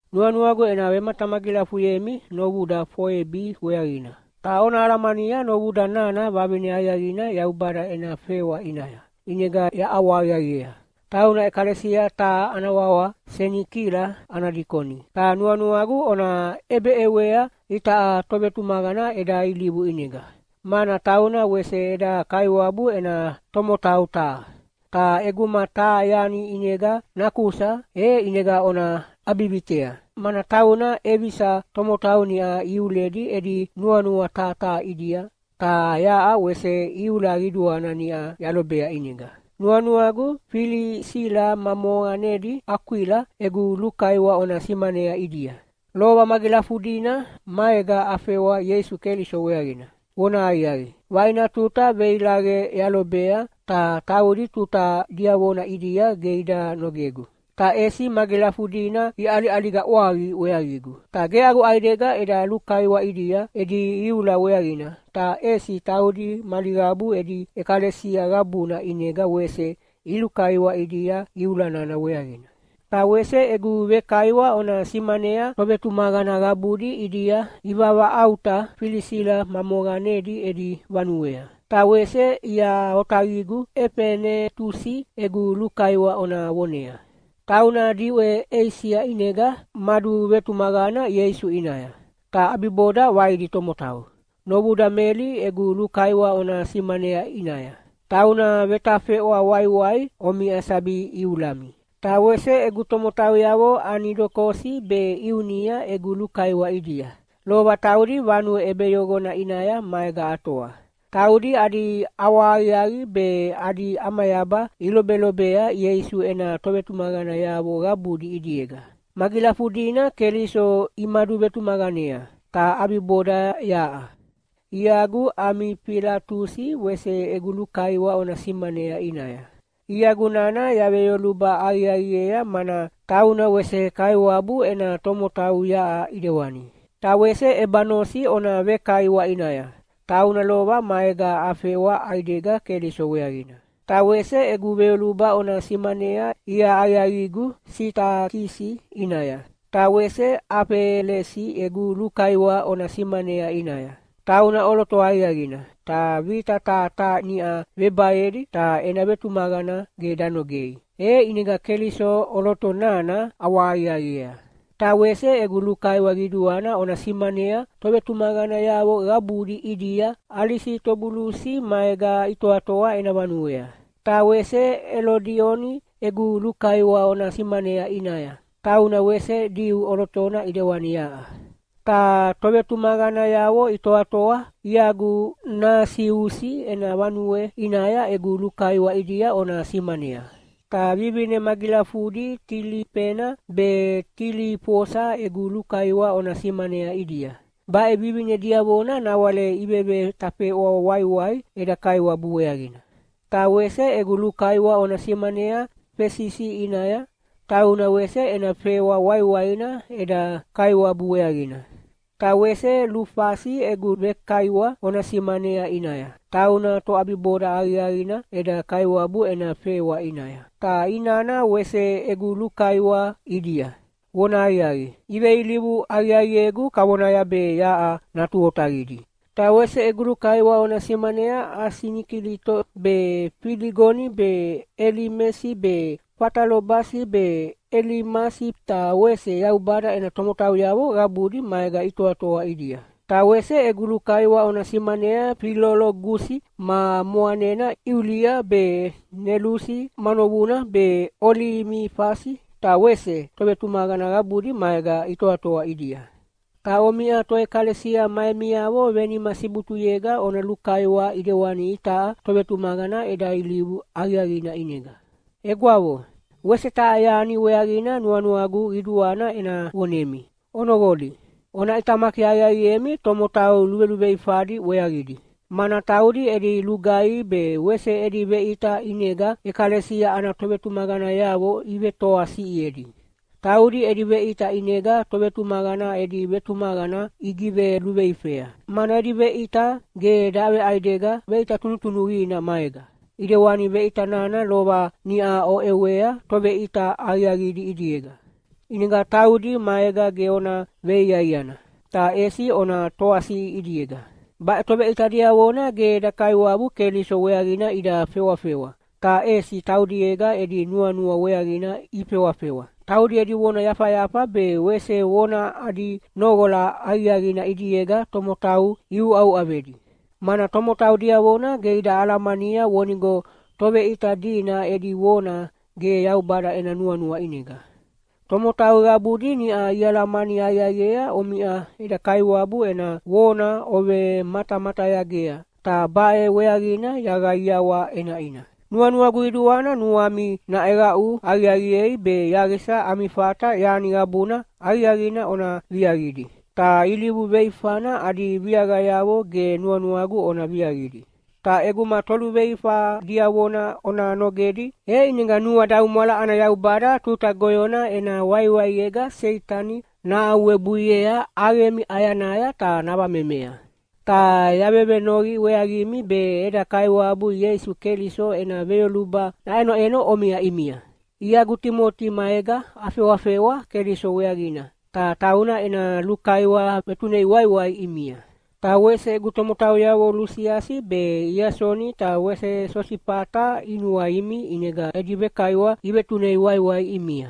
Nuanuagu ena vematamagilafuyemi novuda Foebi weaqina. Ta ona alamania novuda nana vavine aqiaqina Yaubada ena fewa ʼinaya, ʼinega yaʼawahaqiaqiea. Tauna ʼekalesia taha ana wawa Senikila ana dikoni. Ta nuanuagu ona ʼebeʼewea itaʼa tovetumaqana eda ilivu ʼinega, mana tauna wese eda Kaiwabu ena tomotau taha. Ta ʼeguma taha yani ʼinega nakusa, e ʼinega ona ʼabivitea, mana tauna ʼevisa tomotau niʼa iuledi edi nuanua taha taha ʼidia, ta yaʼa wese iula qiduana niʼa yalobea ʼinega. Nuanuagu Filisila ma moqanedi Akwila egu lukaiwa ona simanayea ʼidia. Lova magilafudina maega afewa Ieisu Keliso weaqina. Vonahaqiaqi, vaina tuta veilaqe yalobea ta taudi tuta diavona ʼidia ge ida nogegu, ta ʼesi magilafudina iʼaliʼaliga ʼwaqi weaqigu. Ta ge agu ʼaidega eda lulukaiwa ʼidia edi iula weaqina, ta ʼesi taudi mali qabu edi ʼekalesia qabuna ʼinega wese ilulukaiwa ʼidia iula nana weaqina. Ta wese egu vekaiwa ona simanea tovetumaqana qabudi ʼidia ivavaʼauta Filisila ma moqanedi edi vanuea. Ta wese ia otaqigu Efenetusi egu lukaiwa ona vonea. Tauna diʼwe Eisia ʼinega maduvetumaqana Ieisu ʼinaya, ta ʼabiboda vaidi tomotau. Novuda Meli egu lukaiwa ona simanea ʼinaya. Tauna vetafeʼwa waiwai omiʼa sabi iulami. Ta wese egu tomotauyavo Anidokosi be Iunia egu lukaiwa ʼidia. Lova taudi vanue ʼebeyoqona ʼinaya maega atoa. Taudi adi ʼawahaqiaqi be adi ʼamayaba ilobelobea Ieisu ena tovaletuyanayavo qabudi ʼidiega. Magilafudina Keliso imaduvetumaqanea, ta ʼabiboda yaʼa. Iagu Amifilatusi wese egu lukaiwa ona simanea ʼinaya. Iagu nana yaveyoluba aqiaqiea mana tauna wese Kaiwabu ena tomotau yaʼa ʼidewani. Ta wese Ebanosi ona vekaiwa ʼinaya, tauna lova maega afewa ʼaidega Keliso weaqina. Ta wese egu veyoluba ona simanea ia aqiaqigu Sitakisi ʼinaya. Ta wese Afelesi egu lukaiwa ona simanea ʼinaya. Tauna ʼoloto aqiaqina, ta vita taha taha niʼa vebaedi ta ena vetumaqana ge danogei, e ʼinega Keliso ʼoloto nana ʼawahaqiaqiea. Ta wese egu lukaiwa qiduana ona simanea tovetumaqanayavo qabudi ʼidia Alisitobulusi maega itoatoa ena vanuea. Ta wese Elodioni egu lukaiwa ona simanea ʼinaya, tauna wese Diu ʼolotona ʼidewani yaʼa. Ta tovetumaqanayavo itoatoa iagu Nasiusi ena vanue ʼinaya egu lukaiwa ʼidia ona simanea. Ta vivine magilafudi Tilifena be Tilifosa egu lukaiwa ona simanea ʼidia, baʼe vivine diavona nawale ivevetafeʼwa waiwai eda Kaiwabu weaqina. Ta wese egu lukaiwa ona simanea Fesisi ʼinaya, tauna wese ena fewa waiwaina eda Kaiwabu weaqina. Ta wese Lufasi egu vekaiwa ona simanea ʼinaya, tauna toʼabiboda aqiaqina eda Kaiwabu ena fewa ʼinaya. Ta inana wese egu lukaiwa ʼidia. Vonahaqiaqi, iveilivu aqiaqiegu kavonaya be yaʼa natu otaqidi. Ta wese egu lukaiwa ona simanea Asinikilito be Filigoni be Elimesi be Fatalobasi be Elimasi ta wese Yaubada ena tomotauyavo qabudi maega itoatoa ʼidia. Ta wese egu lukaiwa ona simanea Filologusi ma moqanena Iulia be Nelusi ma novuna be Olimifasi ta wese tovetumaqana qabudi maega itoatoa ʼidia. Ta omiʼa toʼekalesia ma emiavo venima sibutuyega ona lukaiwa ʼidewani itaʼa tovetumaqana eda ilivu aqiaqina ʼinega. Egwavo, wese taha yani weaqina nuanuagu qiduana ena vonemi. Onoqoli, ona ʼitamaki aqiaqiemi tomotau luveluveifadi weaqidi, mana taudi edi lugaihi be wese edi veʼita ʼinega ʼekalesia ana tovetumaqanayavo ivetoasiʼiedi. Taudi edi veʼita ʼinega tovetumaqana edi vetumaqana igiveluveifea, mana edi veʼita ge daveʼaidega veʼita tunutunuqina maega, ʼidewani veʼita nana lova niʼa oʼewea toveʼita aqiaqidi ʼidiega. ʼInega taudi maega ge ona veiaiana, ta ʼesi ona toasiʼi ʼidiega. Baʼe toveʼita diavona ge eda Kaiwabu Keliso weaqina ida fewafewa, ta ʼesi taudiega edi nuanua weaqina ifewafewa. Taudi edi vona yafayafa be wese vona adi noqola aqiaqina ʼidiega tomotau iuʼauʼavedi, mana tomotau diavona ge ida alamania vonigo toveʼita dina edi vona ge Yaubada ena nuanua ʼinega. Tomotau qabudi niʼa ialamani aqiaqiea omiʼa eda Kaiwabu ena vona ovematamatayagea, ta baʼe weaqina yaqaiawa ʼenaʼina. Nuanuagu qiduana nuami naʼeqaʼu aqiaqiei be yaqisa ami fata yani qabuna aqiaqina ona viaqidi, ta ilivu luveifana adi viaqayavo ge nuanuagu ona viaqidi. Ta ʼeguma toluveifa diavona ona nogedi, e ʼinega nuadaumwala ana Yaubada tuta goyona ena waiwaiega Seitani nahaʼuwebuiea ʼaqemi ʼayanaya ta navamemea. Ta yavevenoqi weaqimi be eda Kaiwabu Ieisu Keliso ena veyoluba naʼenoʼeno omiʼa ʼimia. Iagu Timoti maega afewafewa Keliso weaqina, ta tauna ena lukaiwa vetunei waiwai ʼimia. Ta wese egu tomotauyavo Lusiasi be Iasoni ta wese Sosifata inuaimi ʼinega edi vekaiwa ivetunei waiwai ʼimia.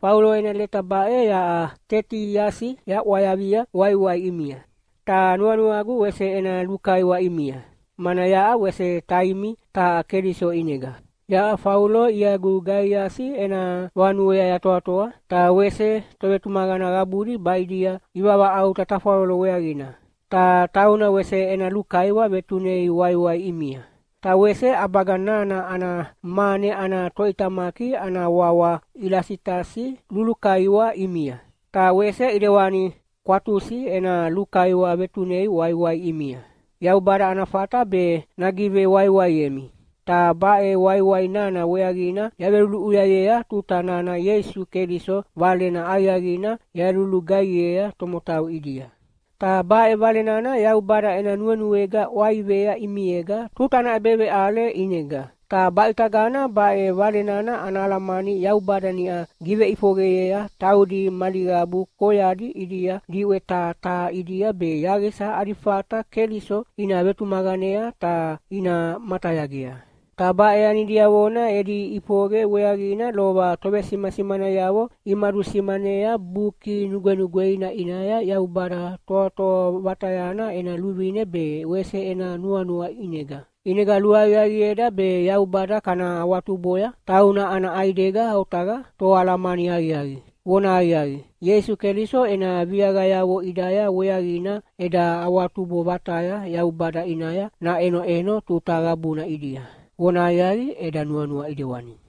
Faulo ena leta baʼe yaʼa Tetiasi yaʼwayavia waiwai ʼimia. Ta nuanuagu wese ena lukaiwa ʼimia, mana yaʼa wese taimi taha Keliso ʼinega. Yaʼa Faulo iagu Gaiasi ena vanuea yatoatoa, ta wese tovetumaqana qabudi baʼidia ivavaʼauta tafwalolo weaqina. Ta tauna wese ena lukaiwa vetunei waiwai ʼimia. Ta wese ʼabaga nana ana mane ana toʼitamaki ana wawa Ilasitasi lulukaiwa ʼimia, ta wese ʼidewani Kwatusi ena lukaiwa vetunei waiwai ʼimia. Yaubada ana fata be nagivewaiwaiemi, ta baʼe waiwai nana weaqina yaveveluluʼuyayea tuta nana Ieisu Keliso Valena Aqiaqina yalulugaihiea tomotau ʼidia. Ta baʼe Vale nana Yaubada ena nuenuega ʼwaivea ʼimiega tuta ana ʼebeveʼale ʼinega. Ta baʼitagana baʼe Vale nana ana alamani Yaubada niʼa giveʼifoqeyea taudi mali qabu koyadi ʼidia diʼwe taha taha ʼidia be yaqisa adi fata Keliso ina vetumaqanea ta ina matayagea. Ta baʼe yani diavona edi ʼifoqe weaqina lova tovesimasimanayavo imadusimanea Buki Nugwenugweina ʼinaya Yaubada Toatoa Vatayana ena luvine be wese ena nuanua ʼinega. ʼInega luaqiaqieda be Yaubada kana awatuboya! Tauna ana ʼaidega otaqa Toalamani aqiaqi. Vonahaqiaqi, Ieisu Keliso ena viaqayavo ʼidaya weaqina eda awatubo vataya Yaubada ʼinaya naʼenoʼeno tuta qabuna ʼidia. Vonahaqiaqi, eda nuanua ʼidewani.